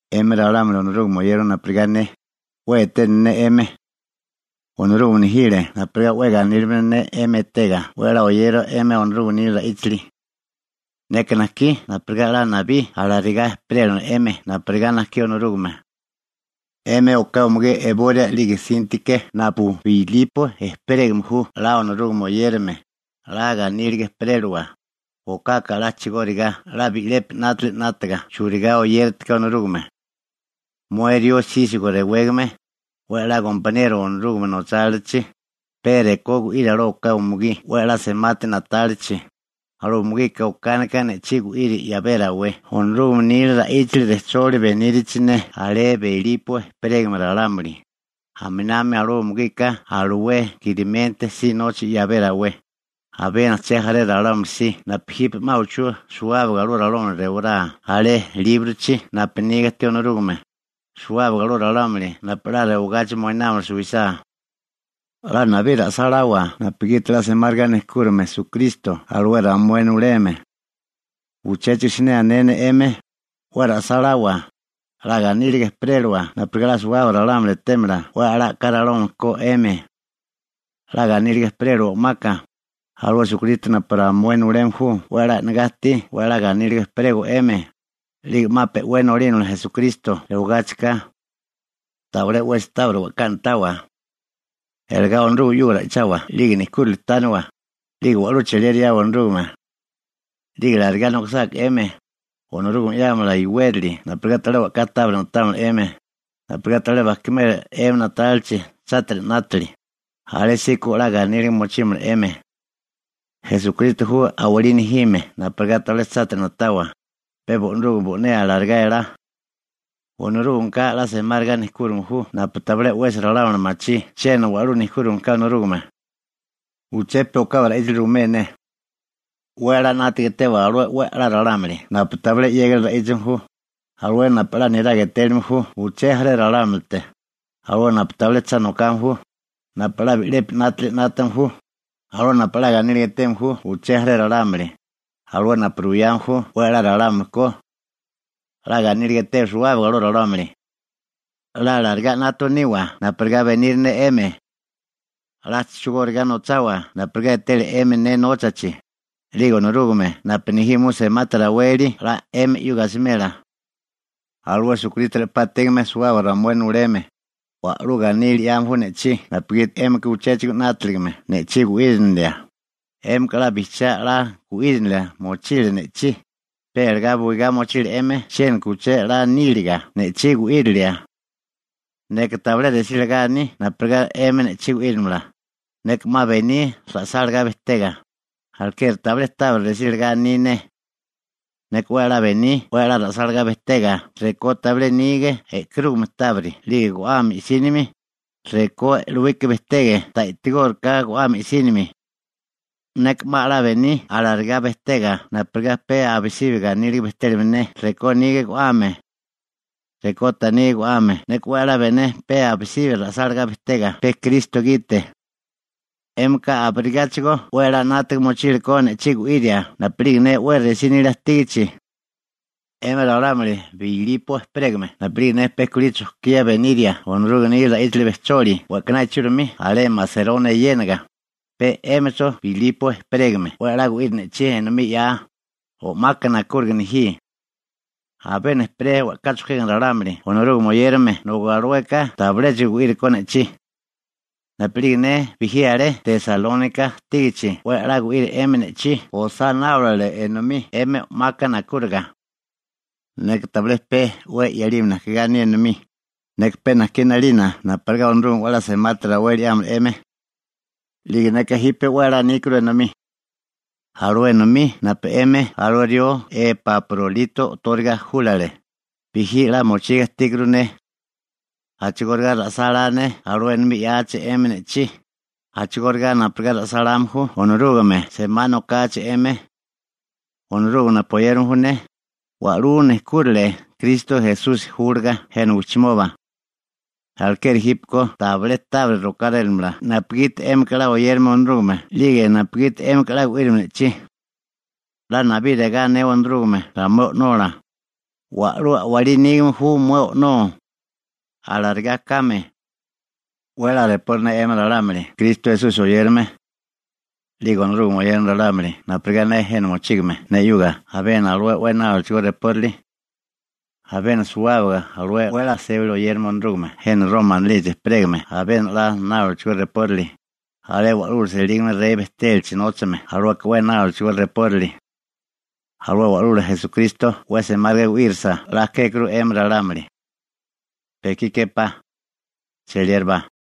'Emi ralámuli Onorúgame oyérame napurigá ne, 'we eténali ne 'emi. Onorúgame nejile napurigá 'we ganílimala ne 'emi etega 'we a'lá oyerio 'emi Onorúgame nila ra'íchali. Neka najkí napurigá 'la nabí alarigá ejperélamala 'emi napurigá najkí Onorúgame. 'Emi oká umugí Eboria 'lige Síntike napu Bilipo ejperégame ju 'la Onorúgame oyérame, 'la ganíliga ejperélawa, okaka 'la a'chigóriga 'la bi'lepi 'nátili 'nátaga churigá oyéritiká Onorúgame. Mué rió Sísigo rewégame, 'we 'la gompaniero Onorúgame nochálilachi, pe rekó gu'iri alué oká umugí 'we 'la semátiri na'tálichi, alué umugika okánika ne'chí gu'iri 'yabé rawé Onorúgame nila ra'íchali rejcholi benírichi ne alé Bilipo ejperégame ralámuli, aminami alué umugika alué Kilimente si nocha 'yabé rawé, abiena uché jaré ralámuli si napu jipe 'ma uchú suwábaga alué ralámuli rewalá alé líbrochi napu niga ajtí Onorúgame, suwábaga alué ralámuli napu 'la rewagachi moinámala suwisá. 'La nabí ra'sáláwa napugiti 'la semáriga nejkúrime Esukristo alué ramué nuleme. Uchéchigo siné ané ne 'emi: ¡'We ra'sáláwa! 'La ganíliga ejperéliwa napurigá 'la suwábaga ralámuli etémala 'we a'lá a'ká ralámuli ko 'emi. 'La ganíliga ejperéliwa o'maka, alué Esukristo napu ramué nuleme ju 'we 'la e'negá ajtí 'we a'lá ganíliga ejperego 'emi, 'lige 'ma pe'wé nolínamala Esukristo rewagáchika. Tabilé 'wesi tábiri we'ká na'tawa. Iligá Onorúgame 'yuga ra'ichawa 'lige nejkúrali tániwa, 'lige wa'lú cheliera 'yawa Onorúgame. 'Lige alarigá nokisáká 'emi, Onorúgame 'yámala iwérali napurigá tabilé we'ká tábiri na'támala 'emi, napurigá tabilé bajkimela 'emi na'tálilachi chátiri 'nátili, alésíko 'la ganíliga mochímala 'emi. Esukristo ju a'walí nejime napurigá tabilé chátiri na'tawa, pe Onorúgame bo'né alarigá elá. Onorúgameka 'la semáriga nejkúrime ju napu tabilé 'wesi ralámuli machí chiena wa'lú nejkúrime ka Onorúgame. Uché pe u'kabi ra'íchali ruimé ne. 'We 'la 'nátaga etewa alué 'we a'lá ralámuli napu tabilé 'yégali ra'íchame ju, alué napu 'la niraga etéliame ju uché jaré ralámulite, alué napu tabilé cha nokame ju, napu 'la bi'lepi 'nátili 'nátame ju, alué napu 'la ganíliga eteme ju uché jaré ralámuli, alué napu ruyame ju 'we a'lá ralámuli ko. 'La ganíliga etewa suwábaga alué ralámuli. 'La alarigá 'nátame niwa napurigá beniri ne 'emi. 'La a'chigóriga nochawa napurigá etele 'emi ne nóchachi, 'lige Onorúgame napu nejime ju semati raweli 'la 'emi 'yuga asimela. Alué Esukristo re'pá ajtígame suwábaga ramué nuleme, wa'lú ganílili 'yame ju ne'chí napugiti 'émika uchéchigo 'nátaligame ne'chí gu'írinilia. 'Émika 'la bijchiá 'la gu'írinilia mochile ne'chí, pe iligá buigá mochile 'emi chiéniko uché 'la níliga ne'chí gu'írilia. Neka tabilé resí lagá aní napurigá 'emi ne'chí gu'írimala, neka 'ma bení ra'sálagá bejtega, alekeri tabilé tábiri resílagá aní ne. Neka 'we 'la bení 'we 'la ra'sálagá bejtega rekó tabilé nige e'karúgame tábiri 'lige go'ame i'sínimi, rekó e'lowika bejtege ta i'tigóriká go'ame i'sínimi. Neka 'ma 'la bení alarigá bejtega napurigá pe abisibi ganíliga bejtélamala ne rekó nige go'ame 'lige rekó ta nige go'ame. Neka 'we a'lá bené pe abisibi ra'sálagá bejtega pe Kristo gite. 'Émika abirigáchigo 'we 'la 'nátaga mochile ko ne'chí gu'iria napu'lige ne 'we resí nilia ajtígichi. 'Emi ralámuli Bilipo ejperégame napu'lige ne pe kulí chojkía beniria Onorúgame nila ra'íchali rejcholi we'kaná ichúrimi alé Maseronia eyéniga, pe 'émicho Bilipo ejperégame 'we 'la gu'iri ne'chí enomí 'ya, o'maka nakúriga nejí. Abiena ejperé we'ká chojkégame ralámuli Onorúgame oyérame nobi alueka tabiléchigo gu'iri go ne'chí. Napu'lige ne bijí alé Tesalónika ajtígichi 'we 'la gu'iri 'emi ne'chí osá náorale enomí 'emi o'maka nakúriga. Neka tabilé pe 'we 'yalime najkigá aní enomí, neka pe najkí 'nalina napurigá Onorúgame 'we 'la semati raweli 'yámala 'emi. 'Lige neka jipe 'we 'la níkuru enomí, alué enomí napu 'emi alué rió Epaprolito o'tóriga júlale, bijí 'la mochiga ajtíkuru ne. A'chigóriga ra'sálá ne alué enomí 'yáachi 'emi ne'chí, a'chigóriga napurigá ra'sáláme ju Onorúgame semá nokachi 'emi. Onorúgame, napu oyérame ju ne, wa'lú nejkúrile Kristo Esusi júlaga jena wijchimoba. Alekeri jípeko tabilé tábiri rokárélamala napugiti 'émika 'la oyérame Onorúgame 'lige napugiti 'émika 'la gu'írame ne'chí. 'La nabí regá anewa Onorúgame ramué O'nola: «Wa'lú a'walí nígame ju mué O'nó.» Alarigá kame. 'We 'la repori ne 'emi ralámuli Kristo Esusi oyérame. 'Lige Onorúgame oyérame ralámuli napurigá ne jena mochígame ne 'yuga abiena alué 'we náolachigó reporali. Abiena suwábaga alué 'we 'la sébali oyérame Onorúgame jena Roma anilichi ejperégame abiena 'we 'la náolachigó reporali, alé alué wa'lula selígame rey bejtélachi nóchame, alueka 'we náolachigó reporali. Alué Wa'lula Esukristo 'we semáriga gu'írisa 'la kékuru 'emi ralámuli. Pe ekí képá. Cheliérabá.